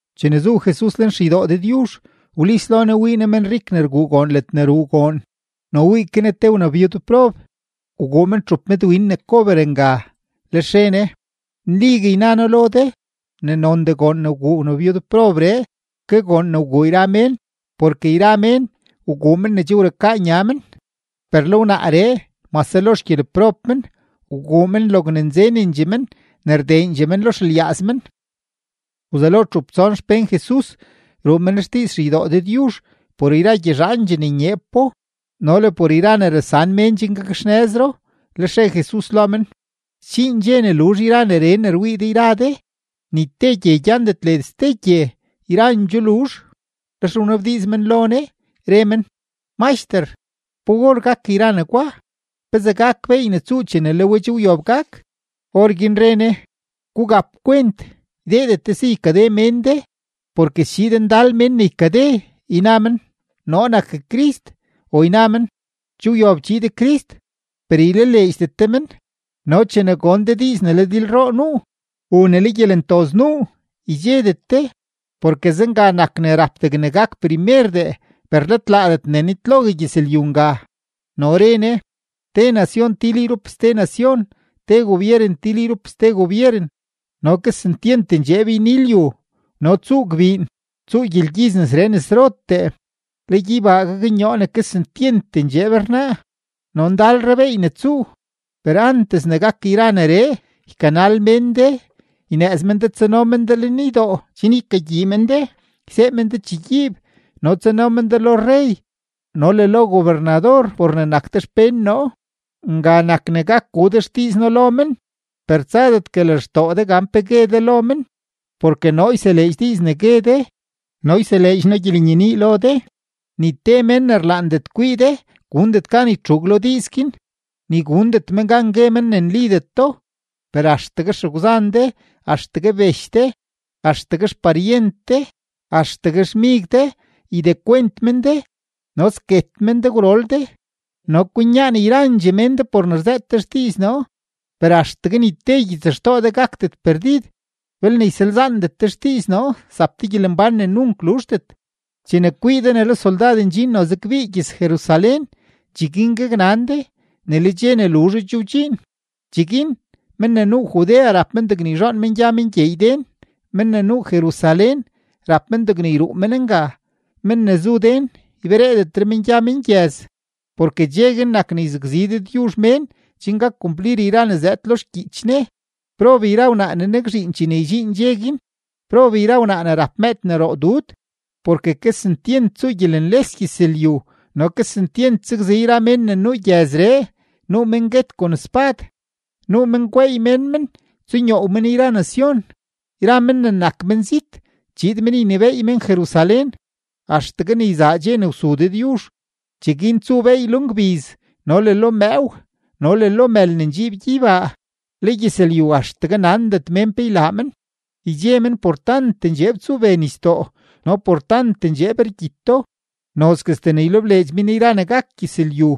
Chene zu Jesus lenxeydoo Dëdyuzh, wlis lo Ne wii Ne menrik ne rguu goon ledne ruu goon. No wii ke Ne te wnabyudprob, wguu men txup medwin ne kober nga. Lex re Ne: ―Nligue yna noo lo de ne nondee goon ne wguu wnabyudprobree ke goon ne wguu yra mén, porke yra mén wguu men ne che wrukaa nya men, per le wnaaree mase lo xgyeleprob men, wguu men logne nzenendxee men ne rdeendxee men lo xelyaaz men. Wzelo txup tson xpén Jesus ruu men xdiiz xeydoo Dëdyuzh por yra gyezhaandxee ne nyeepo no le por yra ne rasan mén chen gakxnëzro. Lex re Jesus lo men: ―Sdxiin dxe ne luzh yra neree ne rwii de yra de, ni te gye gyandet led ste gye, yrandxoo luzh. Lex wnabdiiz men lo Jesus, re men: ―Maxter, ¿pa or gak yra negwa? ¿Pezee gak beey ne tsuu chene le we che wyob gak? Orguin re Ne: ―Gugap kwent, ydeedet de si ykade mén de. Porke schiid ndal mén ne ykade, yna men: “Noo nak Crist”; o yna men: “Che wyob chiid Crist.” Per ylaleedxdet de men. No chene gon de diiz ne le dilroo nuu u ne le gyelentoz nuu, ydxedet de; porke zenga nak ne rap degne gak primerdee, per let laadet ne nitlogue gyëzlyu nga. No re Ne: ―Te nacion til yrup ste nacion, te gobyeren til yrup ste gobyeren. No kesentyent ndxeeb yni lyu, no tsuu gbiin, tsuu gyelgyiz nesree nesrotee, le gyeybaa gaknyoo ne kesentyent ndxeeb rnaa, no ndalre beey ne tsuu. ’Per antes ne gak yra neree, ykanal mén de, ynëëz men de tsano men de lenydoo chen ykagyii men de, ysee men de chegyiib, no tsano men de lo rrey no le lo gobernador por ne nak de xpén noo. Nga nak ne gak gu de xdiiz noo lo men. Per tsadetgue lextoo de gan pe gue de lo men. Porke noo yseleedx diiz ne gue de no yseleedx noo gyelenyenii lo de; ni te mén ne rlaandet kwii de gundet gan ytxuug lo diiz guin, ni gundet men gan gue men ne nlideto. Per axtegue xegwzan de, axtegue bech de, axtegue xparyent de, axtegue xmig de ydekwent men de, no sket men de gwrol de, no kwinyaan yrandxee mén de por ne rzëët de xdiiz noo. Per axtegue ni te gyitsxtoo de gakdet perdid. Belne ysalzaandet de xdiiz noo, zap de gyelembán ne nunk luzhdet. ’Chene kwii de ne le soldad ndxin noze kbii gyëz-Jerusalén, cheguin gaknan de ne le dxe ne luzho che wdxiin. Cheguin men ne nuu Judea rap men degne yzhoon men gya men gyeey den; men ne nuu Jerusalén rap men degne yruu men nga; men ne zu den ybereedetre men gya men gyëz. Porke dxe guin nak ne yzakzi Dëdyuzh mén chen gak kumplir yra ne zëëd lo xgyiich Ne. ¡Prob yra wnaa ne nakzhiin chene ydxiin dxe guin! ¡Prob yra wnaa ne rap mëëd ne roo dud! Porke kesentyent tsuu gyelenles gyëzlyu no kesentyent sakzi yra mén ne nuu gyëzree. Nuu men guet kon spad, nuu men gweey mén men tsunyoow men yra nacion; yra men ne nak menzit chiid men ynebééy men Jerusalén axtegue ne yzaa dxe ne wsu Dëdyuzh. ’Cheguin tsuu beey lo ngbiz, no le lo mëëw, no le lo mël ne ndxiib gyeybaa; le gyëzlyu axtegue nandet mén pe ylaa men, ydxe men por tant ndxeeb tsube nisdoo no por tant ndxeeb rgyito. Nozguestee ne ylebleedx men yra ne gak gyëzlyu,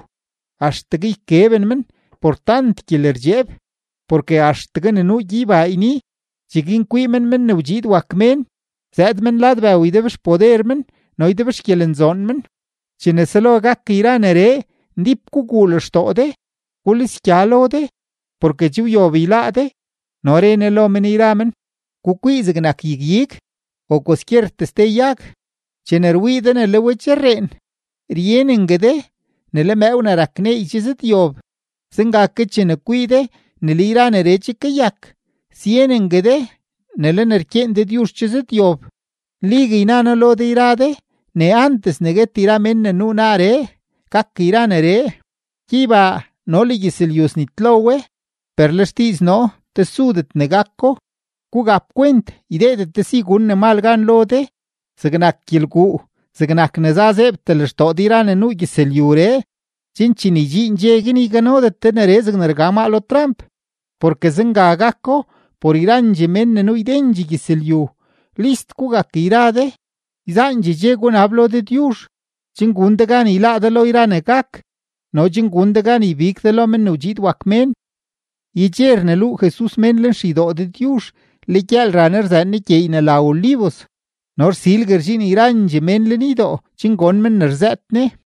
axtegue ykeben men por tant gyelerdxeeb; porke axtegue ne nuu gyeybaa yni. Cheguin kwii men Men ne wdxiid wak Mén zëëd men lad bëw ydebxpoder men no ydebxgyelenzoon men. Chene selo gak yra neree, ndíp guguu lextoo de, gulisgya lo de, porke che wyob yláá de. No re Ne lo men yra men: ―Gukwii zegnak yag-ig o kwaskyertee ste yag. Chene rwii de ne le we che rreen, ryenengue de ne le mëëw ne rak neey che zëdyob. Zenga ke chene kwii de ne le yra neree che kayak, syenengue de ne le ne rkyeen Dëdyuzh che zëdyob. ’Nligue yna noo lo de yra de ne antes ne guet yra mén ne nuu naaree, gak yra neree. Gyeybaa no le gyëzlyu snitlo we, per le xdiiz noo tesudet ne gako. ’Gugap kwent, ydeedet de si gun ne mal gan lo de, zegnak gyelguu, zegnak ne za zeebtee lextoo de yra ne nuu gyëzlyuree, chen chene ydxiin dxe guin, yganodet de neree zegne rga maa lo tramp, porke zenga gako por yrandxee mén ne nuu ydendxee gyëzlyu. List gugak yra de, yzaandxee dxe gunab lo Dëdyuzh, chen gun de gan yláá de lo yra ne gak no chen gun de gan ybig de lo Men ne wdxiid wak Mén. Yedxe rneluu Jesus mén lenxeydoo Dëdyuzh, le gyëël ra Ne rzëën Ne gyeey ne la Olivos. No rsilgue rdxiin yrandxee mén lenydoo chen gon men ne rzëët Ne.